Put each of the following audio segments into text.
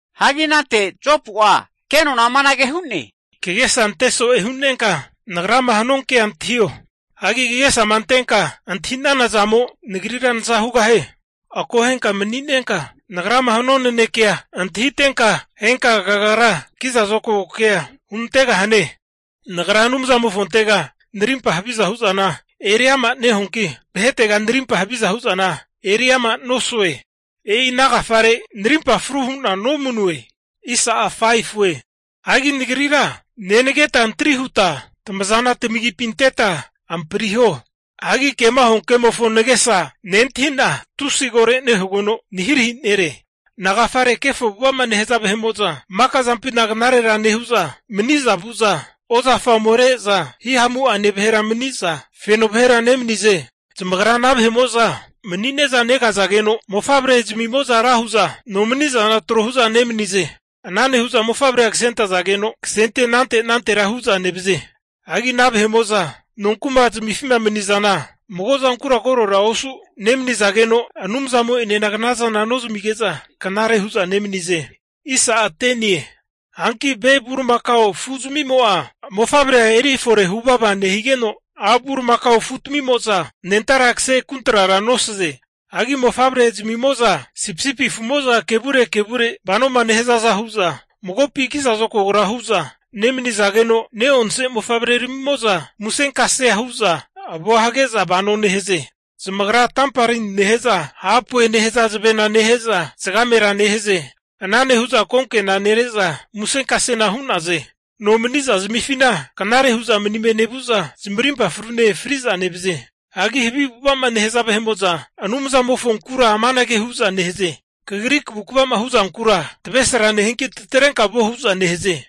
Hagi anante Jopu'a kenona amanage hu'ne, Kagesa ante so'e hu'nenka nagrama hanuankea antahio. Hagi kagesama antenka antahi'nana zamo nagrira naza hugahie. Akohenka mani'nenka nagrama hanua nanekea antahitenka, henka kagra kiza zokago kea hunantegahane. Nagra Anumzamofontega narimpa haviza hu'zana eri ama nehuanki, vahetega narimpa haviza hu'zana eri ama nosue. E'i ana agafare narimpa fru hu'na nomanue. Hanki nagrira nenageta antri huta tamazana tamagipi anteta anikafriho. Hagi kema huankemofo nagesa nentahi'na tusi koro nehugeno, nahirahi nere. Nagafare kefo avu'ava'ma nehaza vahe'mo'za maka zampina knarera nehu'za, mani'za vu'za ozafa omere'za himamu'ane vahera maniza feno vahera nemanize? Zamagra ana mani'ne'za negazageno mofavrezmimo'za ra hu'za nomani'zana trohu'za nemanize. Ana nehu'za mofavrea kasentazageno kase anante anantera hu'za nevaze. Hagi ana vahe'mo'za nonkumazmifima mani'zana mago'zankura korora osu nemanizageno, Anumzamo'enena knazana nozmige'za, knare hu'za nemanize. Hanki ve bulimakao afuzmimo'a mofavrea eri fore huvava nehigeno, a' bulimakao afutamimo'za anentara kase kuntrara nosaze. Hanki mofavrezmimo'za sipisipi afumo'za kevure kevure vanoma nehazaza hu'za magopi kiza zokagora hu'za nemanizageno, neonse mofavreramimo'za musenkasea hu'za avoa hage'za vano nehaze. Zamagra tambarini nehe'za hapue nehaza zavenane nehe'za zagamera nehaze. Ana nehu'za konkena nere'za, musenkasena hu'naze. Nomani'zazmifina knare hu'za manime nevu'za zamarimpa frune fri'za nevaze. Hagi havi avu'ava'ma nehaza vahe'mo'za Anumzamofonkura amanage hu'za nehaze, Kagri kavukva'ma huzankura, tavesra nehianki tatrenka vuo hu'za nehaze.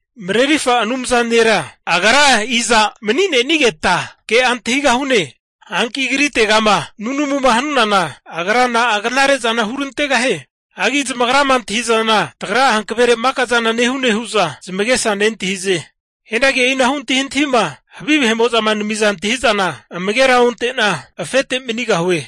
Marerirfa Anumza nera Agra iza mani'nenigeta ke'a antahigahune. Hanki Agritegama nunumuma hanunana, Agra na'a knare zana hurantegahie? Hagi zamagrama antahi'zana tagra'a hankavere maka zana nehune hu'za zamagesa nentahize. Hianagi e'inahu antahintahima havi vahe'mo'zama namiza antahi'zana amagera onte'na, afete manigahue.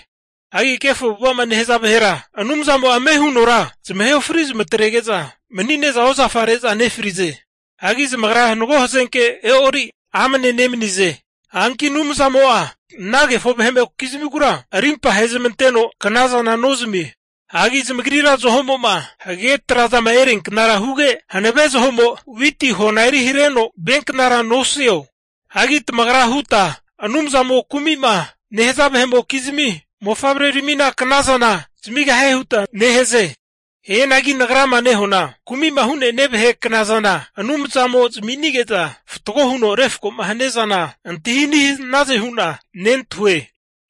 Hagi kefo avu'ava'ma nehaza vahera Anumzamo'a ame hunora zamahe ofri zamatrege'za mani'ne'za ozafare'za nefrize. Hagi zamagra mago hazenke e'ori amne nemanize. Hanki Anumzamo'a ana kefo vahe'mokizmigura arimpa ahezmanteno knazana nozamie. Hagi zamagrira zaho'mo'ma hagage tra'zama erianknara huge, hanave zahomo witi hona eri hareno vianknara nosio? Hagi tamagra huta, Anumzamo kumima nehaza vahe'mokizmi mofavreramina knazana zamigahie huta nehaze. Hianagi nagrama nehuana kumi'ma hu'ne'nia vahe knazana Anumzamo zami'nige'za fatgoma huno refkoma hania zana antahi ani hanaze hu'na nentahue.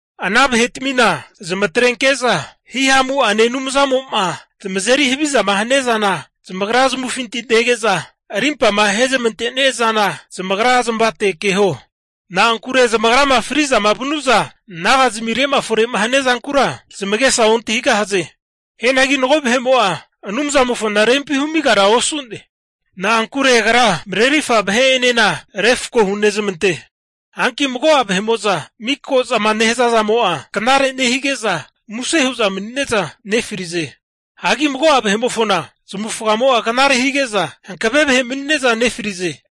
Ana vahetamina zamatrenke'za Hihamu'ane Anumzamo'ma zamazeri havizama hania zana zamagra zamavufinti nege'za, arimpama ahezmantenia zana zamagra zamavate keho. Na'ankure zamagrama fri'zama vanu'za, naga'zmire'ma fore'ma hania zankura zamagesa ontahigahaze. Hianagi mago vahe'mo'a Anumzamofona rempi humigara osu'ne. Na'ankure Agra marerirfa vahe'enena refko hunezmante. Hanki mago'a vahe'mo'za miko zama nehaza zamo'a knare nehige'za muse hu'za mani'neza nefrize. Hagi mago'a vahe'mofona zamavufagamo'a knare hige'za hankave vahe mani'ne'za nefrize.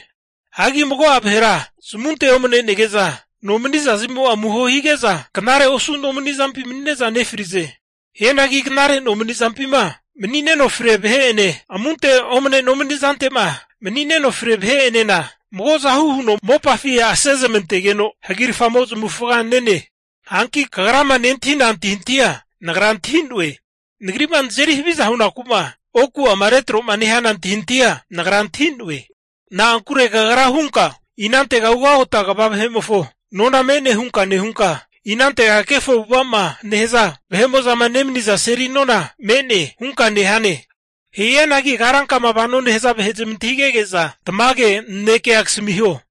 Hagi mago'a vahera zamunte omanege'za nomani'za zmimo'a amuho hige'za knare osu nomani'zampi mani'ne'za nefrize. Hianagi knare nomani'zampima mani'neno fria vahe'ene, amunte omne nomani'zante'ma mani'neno fria vahe'enena mago zahu huno mopafi asezmantegeno hagirafamo zamavufaga nene. Hanki kagrama nentahina antahintahia nagra antahi'noe. Nagri'ma nazeri haviza hunaku'ma oku'ama retro'ma nehana antahintahia nagra antahi'noe. Na'ankure kagra hunka, inantega ugagota kva vahe'mofo nona me'ne hunka nehunka, inantega kefo avu'ava'ma nehaza vahe'ma nemaniza seli nona me'ne? hunka nehane. Hianagi karankama vanoma nehaza vahe zamantahigege'za tamage nanekea kasamiho.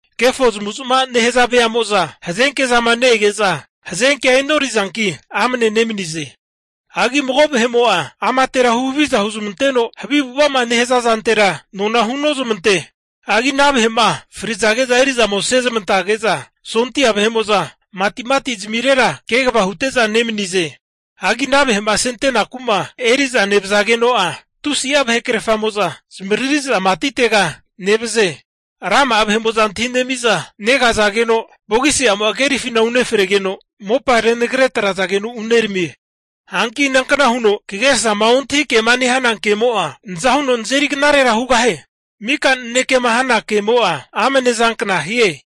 Kefo zamavu'zmava'ma nehaza veamo'za hazenke zama ne-ege'za hazenkea e'norizanki amne nemanize. Hagi mago vahe'mo'a amatera huhaviza huzmanteno havi avu'ava'zama nehaza zantera nona hunozmante. Hagi ana vahe'ma frizage'zama eri'za ome asezmantage'za sondia vahe'mo'za matimati zamirera kegava hute'za nemanize. Hagi ana vahe'ma asentenaku'ma eri'za nevazageno'a, tusi'a vahekrerfamo'za zamavariri'za matitega nevaze. Rama'a vahe'mo'za antahinemi'za negazageno vogisi'amo'a kerifina uneramigeno, mopa ragana atrazageno uneramie. Hanki inankna huno kagesama ontahi kema nehana kemo'a naza huno nazeri knarera hugahie? Mika nanekema hana kemo'a amnezankna hie!